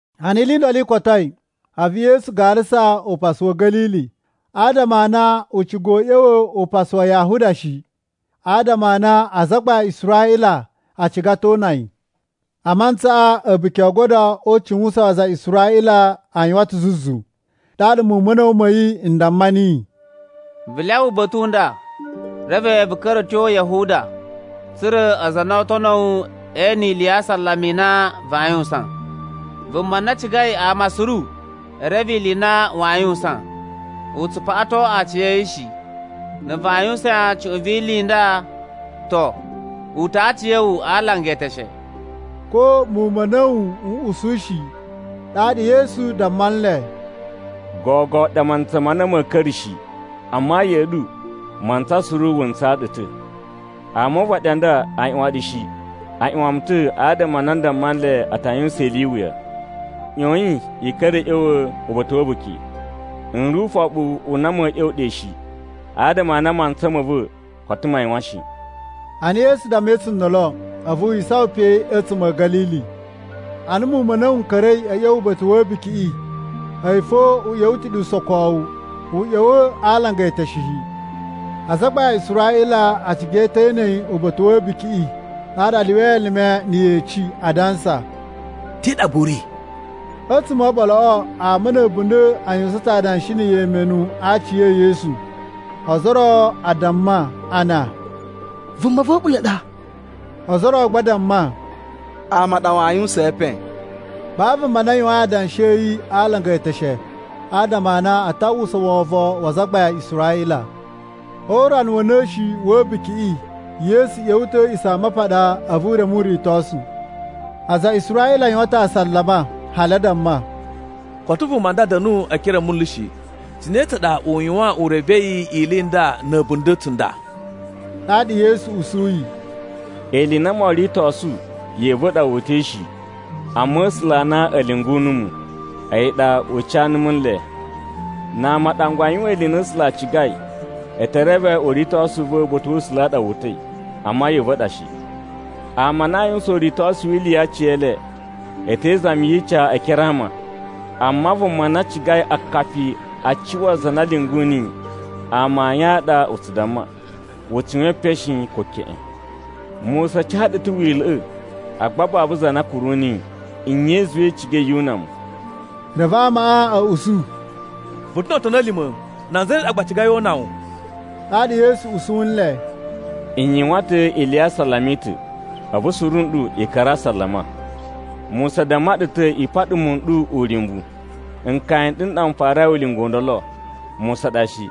Ana ili i ndolo i kotoi, a̱vu Yesu garasa upasu wa̱ Ga̱lili, adama a na u ciga u ꞌya̱wa̱ upasu wa Yahuda shi, adama a na azagbain a Israꞌila a ciga ta̱ o una yi. A mantsaꞌa A̱buki o Ogodo o Ucuwusan a aza a Israꞌila a yuwan ta̱ zuzu. Ɗaɗa muwun ma̱ a̱na̱wu ma̱ yi n damma niyi, “Vu lyawa uba̱ta̱ u nda reve vu ka̱ra̱ a̱ tyo Yahuda, tsa̱ra̱ aza a na oo tono wu e ene ili ya asalama i na vaa yuwusan. Vuma na cigai ama suru e reve ili i na waa yuwusan, u tsu paꞌaton aciya̱yi shi. Na̱ vaa yuwusan cuꞌun vi ili i nda, to, uta̱a̱ aciya̱wu a alanga eteshe.” Ko muwun ma̱ a̱na̱wu n usu shi. Ɗaɗa Yesu damma nle, “Gogo ɗa mantsa ma na ma̱a̱ ka̱ra̱ shi. Amma ya̱ꞌa̱ ɗu, mantsa suru wu ntsaa ɗu ta̱. Ama o uvaɗi u nda aa ꞌyuwan ɗu shi. A ꞌyuwan mu ta̱ adama a na n damma nle a ta yuwusan ili i iwuya. ꞌYoyin i ka̱ra̱ a̱ ꞌya̱wa̱ uba̱ta̱ wa̱ a̱buki. N ri ufoɓu u na ma̱a̱ ꞌya̱wa̱ ɗe shi, adama a na mantsa ma̱ va̱ koto ma yuwan shi.” Ana Yesu dammai tsundolo, a̱vu wi isawan pe a̱tsuma̱ a̱ Ga̱lili. Ana muwun ma̱ a̱na̱wu n ka̱ra̱i a̱ tyo uba̱ta̱ wa̱ a̱bukiꞌi, a̱yi fo u ꞌya̱wa̱ ta̱ ɗe usokowu, u ꞌya̱wa̱ a alanga e eteshe shi. Azagbain a Israꞌila a ciga ta̱ e ene yi uba̱ta̱ wa̱ a̱bukiꞌi, ɗaɗa a lyuwai elime na̱ yeci adansa, “Te ɗa gba u ri?” A̱tsuma̱ o oɓoloꞌo, ama na̱ a̱bunda̱ a yuwusan ta̱ adanshi na̱ yemenu a aci e Yesu. Ozo o ro a damma a na, “Vuma va̱ a̱ɓula̱ ɗa.” Ozo o ro gba a damma, “Ama a ɗa waa yuwusaan epen.” Babu vuma na yuwain adanshi a̱ yi a alanga e eteshe, adama a na a ta uwwusa wovon wa azagbain a Israꞌila. O urana wa̱ na̱shi wa̱ a̱bukiꞌi, Yesu ꞌya̱wa̱ ta̱ a̱ A̱a̱ꞌisamapaɗa, a̱vu u reme uritosu. Aza a Israꞌila a yuwan ta̱ asalama hali a damma, “Koto vuma nda da̱nu e ekere a manlu shi. Cine tsa ɗa u yuwan u revei ili i nda na̱ a̱bunda̱ tsunda?” Ɗaɗa Yesu usuyi, “Ili i na moo ritosu ya̱ꞌa̱ va̱ ɗa wu uta̱i shi, amma A̱sula̱ a na a̱ lyungu numu, a̱yi ɗa u ca numu ele. Na ama a ɗangwa a yuwan ili i na A̱sula̱ a cigai, e te reve uritosu u va̱ uba̱ta̱ wa̱ A̱sula̱ u ɗa wu uta̱i, amma ya̱ꞌa̱ va̱ ɗa shi. Ama a na aa yuwusan uritosu wi ili ya aciyele, e te izami yi ica e ekere a ama. Amma vuma na cigai akapi a cuwa za na lyungu niyi, amayun a ɗa u tsu damma. U tsu yuwan epen shi, ko keꞌen. Musa ca ɗu ta̱ Wila̱ꞌa̱, agba babu za na kuru niyi. Nye i zuwai i cigai yu una mu?” Reve amaꞌa a̱ usu, “Vu ta̱ no otoni a̱ lima̱! Nan zane ɗa gba a cigai o una wu?” Ɗaɗa Yesu usu nle, “N yuwan ta̱ ili ya asalama i ta̱, a̱vu suru nɗu i ka̱ra̱ a asalama. Musa damma ɗu ta̱ i paɗa muwun n ɗu uryumbu. (Nkaya n ɗu n ɗa n farai ulinga u ndolo, Musa ɗa shi).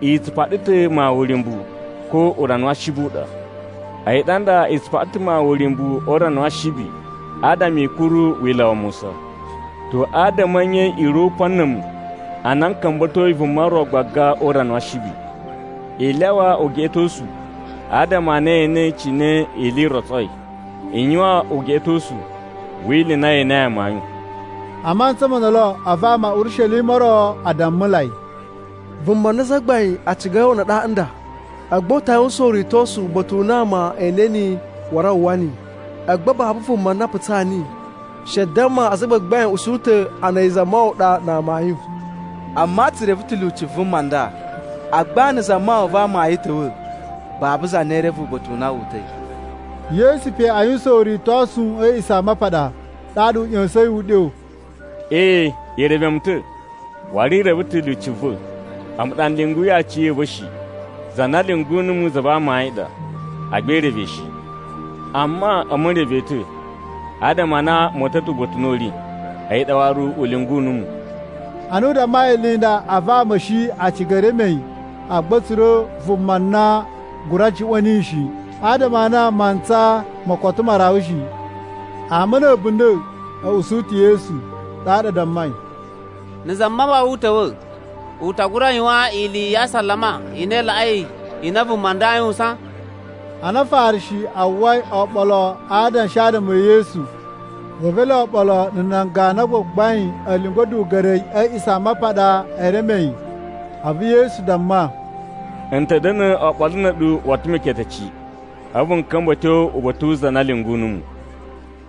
I tsu paɗa ta̱ mawun uryumbu, ko urana wa Ashibi u ɗa. A̱yi ɗa nda i tsu paɗa ta̱ mawun uryumbu o urana wa Ashibi adama i kuru Wila̱ wa Musa. To, adama a̱ nye i ri o upan na̱ a̱mu a na n ka̱mba̱toi vuma ro gbaga o urana wa Ashibi? I lyawa ugeꞌetosu adama a na ye enei cine ili i rotsoi. I yuwan ugeꞌetosu wi ili i na ye enei amayun.” A mantsa mo ndolo, a̱vu ama a̱ Urishelima o ro a dammulai, “Vuma na azagbain a cigai o una ɗaɗa nda. Agba u ta yuwusan uritosu uba̱ta̱ u na ama e ene yi waru a uwwa yi, agba babu vuma na putsaa niyi. She damma azagbagbain a̱ usu ta̱ a na a̱yi Zamawawa ɗa na amayun. Amma tsu reve ta̱ lyuci vuma ndaꞌa. Agba na̱ Zamawawa va amayun ta̱wa̱, babu za na ee reve uba̱ta̱ u na wu uta̱i.” Yesu pe a yuwusan uritosu a̱ A̱a̱ꞌisamapaɗa, ɗaɗa u ꞌya̱sa̱in uɗyo, “Ee, i reve mu ta̱, waru i reve ta̱ lyuci va̱. A̱mu ɗa n lyunguyi aciya̱va̱ shi. Za na lyungu numu za va amayun ɗa, agba i reve yi shi. Amma a̱mu n reve yi ta̱, adama a na mu uta̱ ta̱ uba̱ta̱ u na u ri, a̱yi ɗa waru u lyungu numu.” Ana u dammai ili i nda, a̱vu ama a̱ shi a ciga e reme yi. Agba a̱ tsura̱ vuma na gura juꞌwa̱n niyi shi, adama a na mantsa mo koto ma rawa shi. Ama na̱ a̱bunda̱ a̱ usu ta̱ Yesu. Ɗaɗa a dammai, “Na̱ Zamawawa u ta̱wa̱, u ta gura yuwan ili ya asalama i na i laꞌai ili i na vuma nda aa yuwusan?” Ana Afarishi a uwwai oɓolo a adanshi adama e Yesu, reve ele oɓolo na̱ nan ganu a gbagbain a̱ lyungu a̱duga̱ri a̱ A̱a̱ꞌisamapaɗa e reme yi. A̱vu Yesu damma, “N ta̱ da̱na̱ oɓolo na̱ a̱ɗu woto meketeci, a̱vu n ka̱mba̱ a̱ tyo uba̱ta̱ wu za na lyungu numu.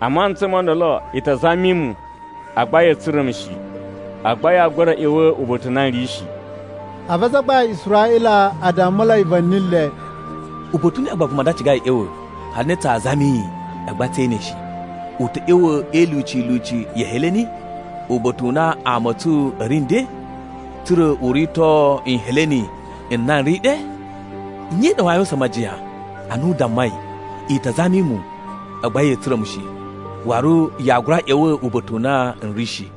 A mantsa mo ndolo, i ta zami mu, agba ya̱a̱ tsura̱ mu shi. Agba yaa gura ꞌya̱wa̱ uba̱ta̱ u na n ri shi.” A̱vu azagbain a Israꞌila a dammulai va̱ni le, “Uba̱ta̱ u ne u ɗa vuma nda cigai u ꞌya̱wa̱ hali na tsaa zami yi agba tsee ene yi shi? U ta̱ ꞌya̱wa̱ e ilyuci ilyuci ya̱ Heleni uba̱ta̱ u na ama a̱ tsu a̱ ri nden tsa̱ra̱ u rito Nheleni n na n ri ɗe? Nye i ɗa waa yuwusan majiyan ana u dammai, ‘I ta zami mu, agba ya̱a̱ tsura̱ mu shi’, waru ‘Yaa gura ꞌya̱wa̱ uba̱ta̱ u na n ri shi’?”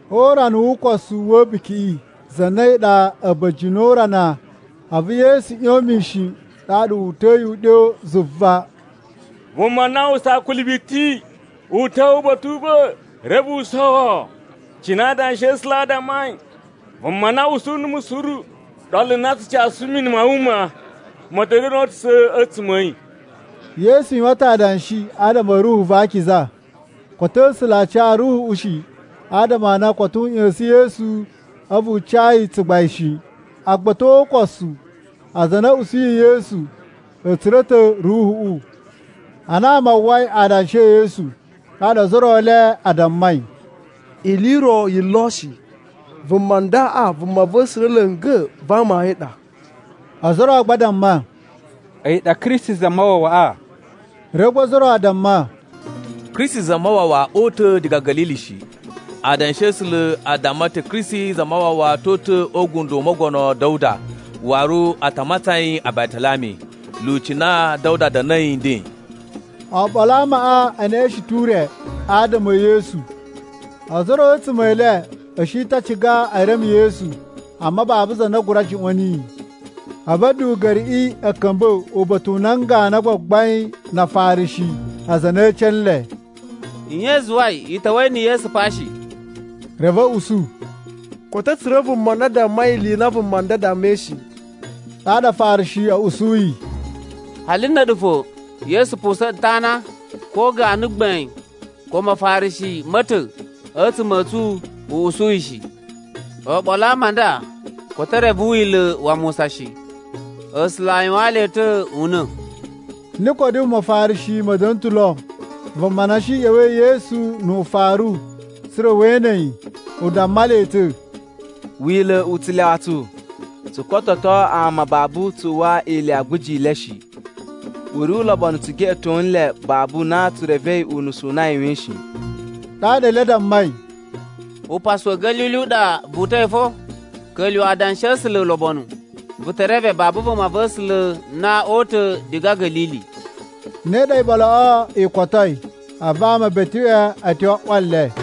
O urana wu ukosu wa̱ a̱bukiꞌi, za na a̱yi ɗa a̱ba̱jini o urana, a̱vu Yesu ꞌyon mishin ɗaɗa wu uta̱yi uɗyo zuva, “Vuma na aa uwwusa akuli biti u ta̱wa̱ uba̱ta̱ u va̱, reve u sowo. Cine Adanshi a̱ A̱sula̱ a dammai, ‘Vuma na usu numu suru, ɗolu na tsu casu mini ma wuma ma̱ ta̱ da̱na̱ oo utusa̱ a̱tsuma̱ a̱ yi.’” Yesu yuwan ta̱ adanshi adama a̱ Ruhu va Akiza. Koto A̱sula̱ a ca Ruhuꞌu shi, adama a na koto u ꞌya̱sa̱n Yesu a̱vu u ca yi tsugbain shi. Agba a̱ tyo o ukosu, aza a na a̱ usuyi Yesu a̱ tsura̱ ta̱ Ruhuꞌu. Ana ama a uwwai adanshi e Yesu, ɗaɗa ozo o ro e le a dammai, “Ili i ro yi lo shi, vuma ndaꞌa Vumava̱sula̱ la̱nga̱ va amayun ɗa.” Ozo o ro gba a damma, “A̱yi ɗa Kristi Zamawawaꞌa.” Reve gba ozo o ro a damma, “Kristi Zamawawa oo uta̱ diga Ga̱lili shi. Adanshi a̱ A̱sula̱ a damma ta̱ Kristi Zamawawa to uta̱ o ugundo u Mogono Da̱wuda waru a ta matsan yi Batalami, lyuci na Da̱wuda da̱na̱i nden.” Oɓolo a amaꞌa e neꞌeshen ta̱ ure adama e Yesu. Ozo o ro a̱tsuma̱ e le a̱ shi ta̱ a ciga e reme Yesu, amma babu za na gura juꞌwa̱n niyi. A̱vu a̱duga̱riꞌi a̱ ka̱mba̱ uba̱ta̱ u nan ganu a gbagbain na Afarishi, aza a na e ece nle, “Nye i zuwai i ta̱wa̱i na̱ Yesu pa shi?” Reve a̱ usu, “Koto a̱ tsura̱ vuma na dammai ili i na vuma nda dammai shi!” Ɗaɗa Afarishi a̱ usuyi, “Hali na̱ a̱ɗu fo Yesu pusa̱n ɗu ta̱ ana? Ko ganu gbain ko Mafarishi ma̱ ta̱ a̱tsuma̱ a̱ tsu a̱ usu yi shi! Oɓolo a ama a nda koto e reve Wila̱ wa Musa shi. A̱sula̱ yuwaan le ta̱ una̱!” Nikodimu Mafarishi ma̱ da̱na̱ ta̱ lo, vuma na shi ꞌya̱wa̱i ya̱ Yesu nu ufaru tsa̱ra̱ we ene yi. U damma le ta̱, “Wila̱ u tsu u lyawa tsu tsu kototo ama babu tsu uwwa ili ya aguji i le shi. U ri ulobonu tsu geꞌeto nle babu na tsu revei unusu u na a yuwain shi.” Ɗaɗa ele a dammai, “Upasu wa̱ Ga̱lili u ɗa vu uta̱i fo? Ka̱lyuwa̱ Adanshi a̱ A̱sula̱ ulobonu, vu te reve babu vumava̱sula̱ na oo uta̱ diga Ga̱lili.” [ Ne ɗa iɓoloꞌo i kotoi, a̱vu ama e beteꞌwe a̱ tyo a ꞌwa le.